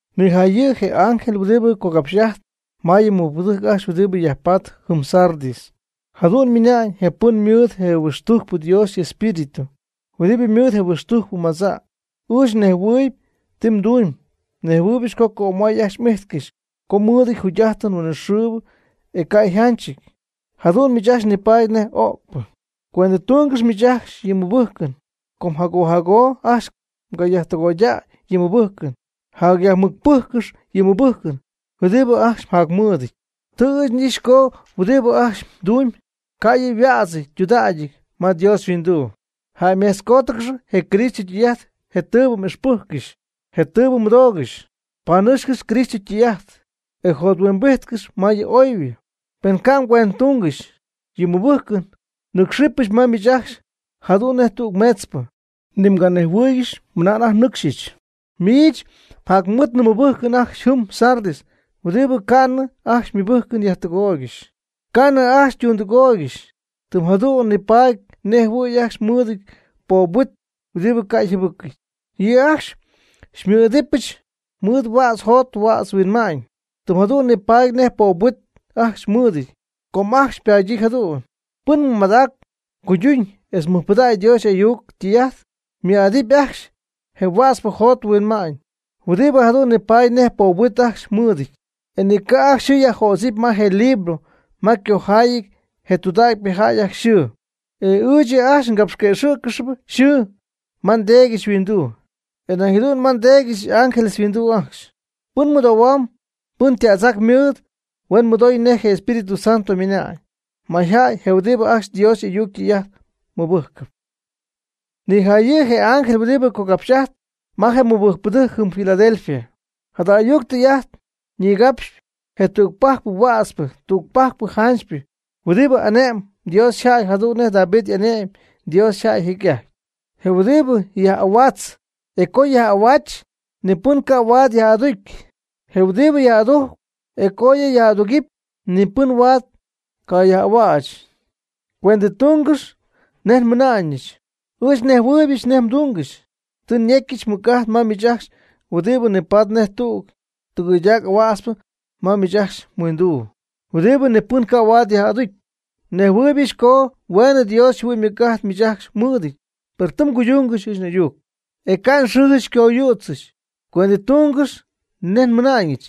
Nijayɨ' je ángel huɨdibɨ cogapx'ajtpɨ ma yɨ mɨbɨjcpɨdɨjc ajcxy huɨdibɨ yajpatp jɨm Sardis: “Jadu'n ymɨna'ñ je pɨn mɨɨd je huɨxtujcpɨ Dios y'espíritu, huɨdibɨ mɨɨd je huɨxtujcpɨ madza': Ɨɨch nejhuɨɨyb ti mdumyb. Nejhuɨɨybɨch co cömay ajcxy m'ijtcɨxy co mmɨɨdɨty yjugy'ajtɨn huinɨxɨɨbɨ e ca' yjanchɨty. Jadu'n miich ajcxy nipaady nej öcpɨ. Cuendɨtungɨx miich ajcxy yɨ mmɨbɨjcɨn, com jago jago ajcxy mgayajtɨgoydäy yɨ mmɨbɨjcɨn. Jayajmɨcpɨjccɨxy yɨ mmɨbɨjcɨn huɨdibɨ ajcxy mjacmɨɨdɨty. Tɨ ɨɨch n'ixy co huɨdibɨ ajcxy mdumyb ca' yɨ' yhuädzɨty ytudägyɨty ma Dios yhuinduu. Jäymejtzcootcɨxy je Cristo ytɨy'ajt je tɨɨbɨ m'ixpɨjccɨxy, je tɨɨbɨ mmɨdoogɨxy. Panɨcxcɨx Cristo ytɨy'ajt e jothuimbijtcɨxy ma yɨ oybɨ. Pen ca' mgüendtungɨxy yɨ mmɨbɨjcɨn, nɨcxɨbɨch ma miich ajcxy jadu'n nej tüg meetzpɨ, ni mganejhuɨ̈huɨ́ɨygɨxɨpy anajty nnɨcxyɨch. Miich jacmɨɨdnɨ mɨbɨjcpɨ ajcxy jɨm Sardis huɨdibɨ ca'nɨ ajcxy ymɨbɨjcɨn yajtɨgooygɨxy, ca'nɨ ajcxy ytundɨgooygɨxy, tɨm jadu'n nipaady nej jɨhuɨ̈y ajcxy mɨɨdɨty poob huit huɨdibɨ ca' yjɨbɨcɨ̈y. Yɨ' ajcxy xymɨɨd'idɨpɨch mɨɨd huädz jot huädz huinma'ñ, tɨm jadu'n nipaady nej ypoob huit ajcxy mɨɨdɨty, com ajcxy ypadyii jadu'n. Pɨn mɨmadacp cuyduñ etz mɨjpɨdägy Dios y'ayuc ytɨy'ajt, ymɨɨd'adɨpy ajcxy je huätzpɨ jot huinma'ñ, huɨdibɨ jadu'n nipatp nej poob huit ajcxy mɨɨdɨty. E ni ca' ajcxy yxɨɨ yajjödzɨp ma je libro ma ycojaayɨty je tudägypɨ jäy ajcxy yxɨɨ. E ɨɨch yɨ' ajcxy ngapxquëxɨ̈ccɨxy yxɨɨ ma nDeedyɨch yhuinduu, e nañ jadu'n ma nDeedyɨch y'ángeles yhuinduu ajcxy. Pɨn mɨdoohuamb, pɨn ytädzac mɨɨd, huen mɨdoy nej je Espíritu Santo ymɨna'ñ majaty je huɨdibɨ ajcxy Dios y'ayuc ytɨy'ajt mɨbɨjcɨp.” Nijayɨ' je ángel huɨdibɨ capxy'ajtp ma je mɨbɨjcpɨdɨjc jɨm Filadelfia: “Jada ayuc tɨy'ajt ñigapxyp je tügpajcpɨ huätzpɨ, tügpajcpɨ janchypɨ, huɨdibɨ ane'my Dios yjäy jadu'n nej David ane'my Dios yjäy jecy'ajty. Je huɨdibɨ yaj'ahuaatzp e co yaj'ahuäch ni pɨn ca' huaad yaj'aducy. Je huɨdibɨ yaj'adujcp e co yɨ' yaj'aducy, ni pɨn ca' huaad yaj'ahuäch: Cuendɨtungɨx nej nmɨna'ñɨch: Ɨɨch nejhuɨɨybɨch nej mdungɨxy. Tɨ nyecyɨch mɨc'ajt ma miich ajcxy huɨdibɨ nipaady nej tüg tɨgɨydac ahuätzpɨ ma miich mhuinduu, huɨdibɨ ni pɨn ca' huaad yaj'aducy. Nejhuɨɨybɨch co hueenɨ Dios yjɨhuɨ'ñ ymɨc'ajt miich ajcxy mɨɨdɨty. Per tɨ mguydungɨxy ɨɨch n'ayuc, e ca' nxɨɨjɨch xycoyützɨ. Cuendɨtungɨx nej nmɨna'ñɨch.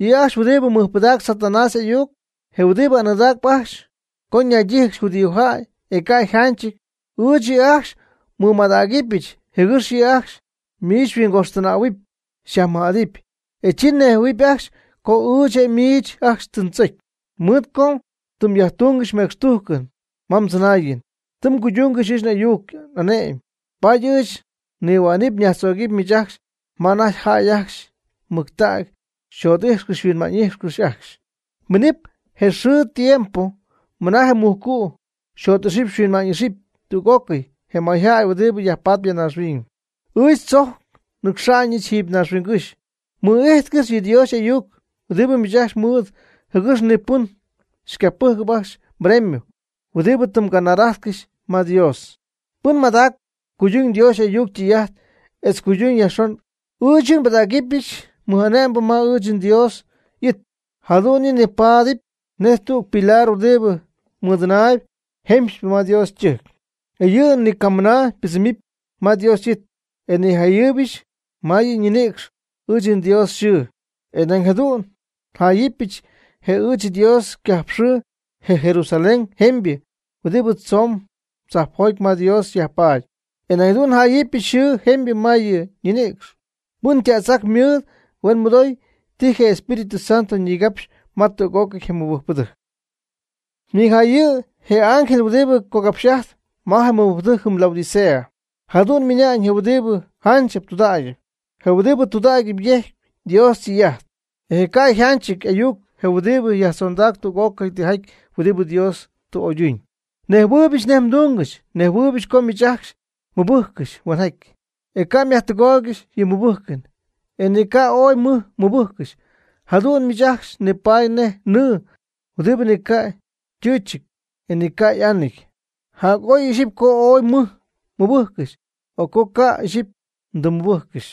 Yɨ' ajcxy huɨdibɨ mɨjpɨdacp Satanás y'ayuc, je huɨdibɨ anɨɨdacp ajcxy co ñaydíjɨgɨxy judíojäy, e ca' yjanchɨty. Ɨɨch yɨ' ajcxy nmɨmadägɨbɨch jɨgɨx yɨ' ajcxy miich xyhuingojxtɨnähuɨpy xyajmɨj'adɨpy. E chi nejhuɨ̈huɨp ajcxy co ɨɨch miich ajcxy tɨ ndzocy. Mɨɨd co tɨ myajtungɨxy mecxtujcɨn ma mdzɨnaayɨn, tɨ mguydungɨxy ɨɨch n'ayuc n'ane'mɨn. Paady ɨɨch nihua'nɨp yajtzögɨp miich ajcxy ma anajty jäy ajcxy mɨctägy xyjot'ijxcɨxy xyhuinma'ñ'ijxcɨxy ajcxy. Miinɨpy je xɨɨ je tiempo mɨna je mujcu' jot'ixɨpy huinma'ñ'ixɨpy tüg'ócɨy je mayjäy huɨdibɨ yajpatp ya naaxhuiñ. Ɨɨch tzojc nnɨcxa'ñɨch jɨɨby naaxhuingɨ́xy. Mɨ'ijtcɨxy yɨ Dios y'ayuc huɨdibɨ miich ajcxy mɨɨd jɨgɨx ni pɨn xycapɨjcɨp ajcxy mbremio, huɨdibɨ tɨ mganar'ajtcɨxy ma Dios. Pɨn mɨmadacp cuyduñ Dios y'ayuc ytɨy'ajt etz cuyduñ yajxon, ɨɨch yɨ' nbɨdägɨbɨch mɨj'ane'mbɨ ma ɨɨch nDios y'it, jadu'n yɨ' nipaadɨp nej tüg pilar huɨdibɨ mɨdɨnaayb jemxypɨ ma Dios ytɨjc. E yɨ' ni camɨna ypɨdzɨmɨpy ma Dios y'it, e njayɨ́ɨyɨbɨch ma yɨ' ñinïcx ɨɨch nDios yxɨɨ, e nañ jadu'n njáayɨbɨch je ɨɨch nDios ycajp yxɨɨ, je Jerusalén jemybɨ huɨdibɨ tzoon tzajpjoty ma Dios yajpaady. E nañ jadu'n njáayɨbɨch nxɨɨ jemybɨ ma yɨ' ñinïcx. Pɨn ytädzac mɨɨd huen mɨdoy ti je Espíritu Santo ñigapxyp ma tüg'ócɨy je mɨbɨjcpɨdɨjc.” Nijayɨ' je ángel huɨdibɨ cogapxy'ajtpɨ ma je mɨbɨjcpɨdɨjc jɨm Laodicea: “Jadu'n ymɨna'ñ je huɨdibɨ janchɨp tudägyɨp, je huɨdibɨ tudägy yejcp Dios ytɨy'ajt e ca' yajtɨgach y'ayuc, je huɨdibɨ yajtzondac tüg'ócɨy tijaty huɨdibɨ Dios tɨ oyduñ: Nejhuɨɨybɨch nej mdungɨxy. Nejhuɨɨybɨch co miich ajcxy mɨbɨjccɨxy huenjaty, ca' myajtɨgoydaygɨxy yɨ mmɨbɨjcɨn, e ni ca' ooy mɨj mmɨbɨjccɨxy. Jadu'n miich ajcxy nipaady nej nɨɨ huɨdibɨ ni ca' ytɨchɨty, e ni ca' y'anɨty. Jac'oy ixyipy co ooy mɨj mmɨbɨjccɨxy, o co ca' ixyipy mdɨmmɨbɨjccɨxy.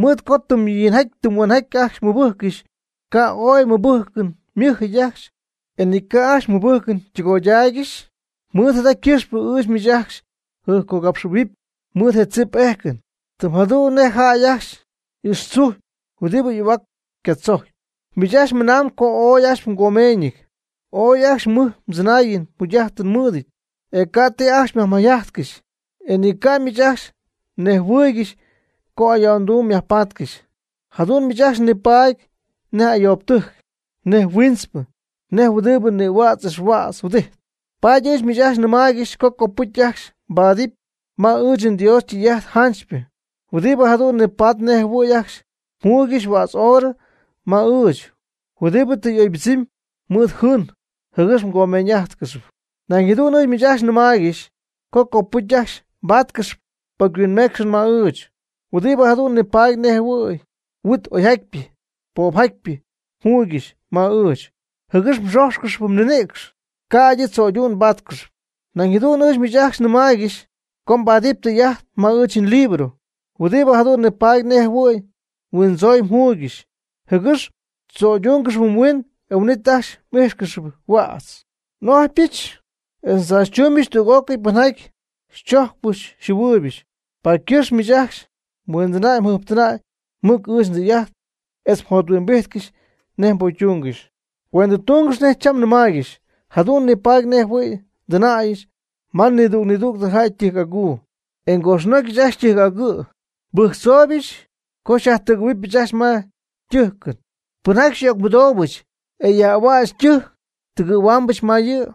Mɨɨd co tɨm yinjaty tɨm huenjaty ajcxy mmɨbɨjccɨxy, ca' ooy mmɨbɨjcɨn ymɨjɨty ajcxy, e ni ca' ajcxy mmɨbɨjcɨn ytɨgoydaaygɨxy, mɨɨd jada ycɨxpɨ ɨɨch miich ajcxy njɨjpcogapxɨ̈huɨpy mɨɨd je ndzip n'éjcɨnɨch, tɨm jadu'n nej jäy ajcxy ixtzujy huɨdibɨ y'ahuac yca'tzojcpy. Miich ajcxy mɨnamb co ooy ajcxy mgomeeñɨty, ooy ajcxy mɨj mdzɨnaayɨn mjugy'ajtɨn mmɨɨdɨty, e ca' ti ajcxy myajmayjajtcɨxy, e ni ca' miich ajcxy nejhuɨɨygɨxy co ayo'nduum myajpatcɨxy. Jadu'n miich ajcxy nipaady nej ayoobɨtɨjc, nej huiintzpɨ, nej huɨdibɨ nïhuädz ixhuädz huɨdijtp. Paady ɨɨch miich ajcxy nɨmaaygɨxy co copɨcy ajcxy mbaadɨp ma ɨɨch Dios ytɨy'ajt janchypɨ, huɨdibɨ jadu'n nipaadɨpy nej jɨhuɨ̈y ajcxy mjuuygɨxy huädz oorɨ ma ɨɨch, huɨdibɨ tɨ y'oybɨdzɨmy mɨɨd jɨɨn jɨgɨx mgomeeñ'ájtcɨxɨp. Nañ jadu'n ɨɨch miich ajcxy nnɨmaaygɨx co copɨcy ajcxy mbáatcɨxɨp pocyhuinmeecxɨn ma ɨɨch, huɨdibɨ jadu'n nipaady nej jɨhuɨ̈y huit oyjatypɨ poopjatypɨ mjuuygɨxy ma ɨɨch, jɨgɨx mxójxcɨxɨpy mninïcx ca'ydɨ tzo'ydu'n mbáatcɨxɨpy. Nañ jadu'n ɨɨch miich ajcxy nnɨmaaygɨx co mbaadɨp tɨy'ajt ma ɨɨch nlibro, huɨdibɨ jadu'n nipaady nej jɨhuɨ̈y huindzooy mjuuygɨxy, jɨgɨx mdzoydúngɨxɨpy mhuin e huin'it ajcxy m'íjxcɨxɨpy huädz. N'ojypɨch etz ndzaachytumyb tüg'ócɨy pɨnjaty ndzojcpyɨch njɨhuɨɨybɨch, paady ycɨxpɨ miich ajcxy mhuindɨna'mjɨjptɨna' mɨc ɨɨch ndɨy'ajt etz jothuimbijtcɨx nej mbocytungɨxy. Cuendɨtungɨx nej cham nnɨmaaygɨx. Jadu'n nipaady nej jɨhuɨ̈y ndɨnäyɨch ma nidüg nidüg jäy ytɨjc'aguu e ngojxnojcɨch ajcxy ytɨjc agɨ'. Nbɨjctzooybɨch co xyajtɨgɨ̈huɨbɨch ajcxy ma ytɨjcɨn. Pɨnjaty xyyöcmɨdoobɨch, e yaj'ahuäch ytɨjc, tɨgɨ̈huɨbɨch ma yɨ',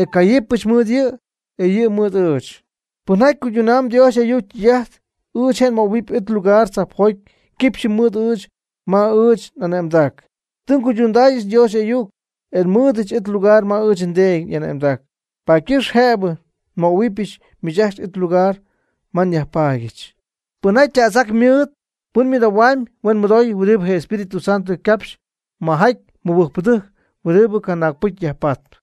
e cayɨpɨch mɨɨd yɨ', e yɨ' mɨɨd ɨɨch. Pɨnjaty cuydundaayb Dios y'ayuc ytɨy'ajt, ɨɨch je' nmöhuɨpy it lugar tzajpjoty quipxyɨ mɨɨd ɨɨch ma ɨɨch n'ane'mdac. Tɨ nguydundaayɨch Dios y'ayuc, e nmɨɨdɨch it lugar ma ɨɨch nDeedy y'ane'mdac, paady ycɨxp jëbɨ nmöhuɨbɨch miich ajcxy it lugar ma nyajpaadyɨch. Pɨn ytädzac mɨɨd, pɨn mɨdoohuamb, huen mɨdoy huɨdibɨ je Espíritu Santo ycapxyp majaty mɨbɨjcpɨdɨjc huɨdibɨ canaagpɨcy yajpatp.”